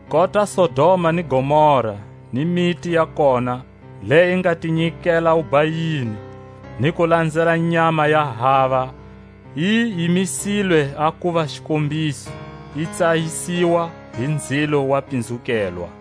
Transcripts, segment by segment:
Kota Sodoma ni Gomora ni miti ya kona, leyi yi nga ti nyikela wubhayini, ni ku lanzela nyama ya hava, yi yimisilwe a kuva xikombiso, yi tsayiswa hi nzilo wa pinzukelwa.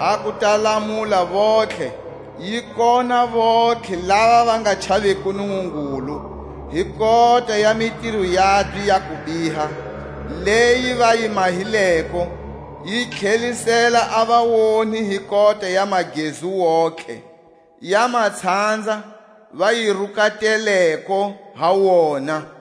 a ku ta lamula vontlhe, yi kona vontlhe lava va nga chaviko Nungungulu hi kota ya mitiro yabye ya kubiha leyi va yi mahileko, yi tlhelisela a vaonhi hi kota ya magezu wontihe ya matshanza va yi rukateleko ha wona.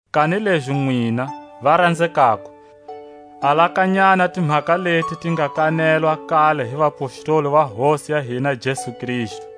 Kanilezi nwina, varanzekako, alakanyani a timhaka leti ti nga kanelwa a kale hi vapostoli va Hosi ya hina Jesu Kristu;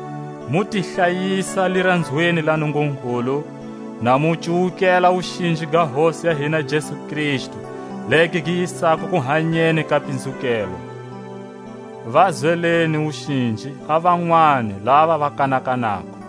mu ti hlayisa liranzweni la Nungungulu, na mu cuwukela a wuxinji ga Hosi ya hina Jesu Kristu legi gi yisako kuhanyeni ka pinzukelwa. Va zweleni wuxinji a vanwani lava va kanakanako;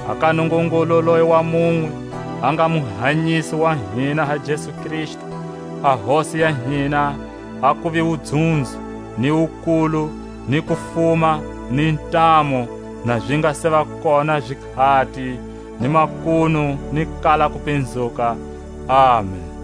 a ka Nungungulu leyi wa munwe a nga Muhanyisi wa hina ha Jesu Kristu, a Hosi ya hina, a kuve wudzunzo, ni wukulu, ni kufuma, ni ntamu, na zi nga seva kona zikhati, ni makunu, ni ku kala kupinzuka. Amen.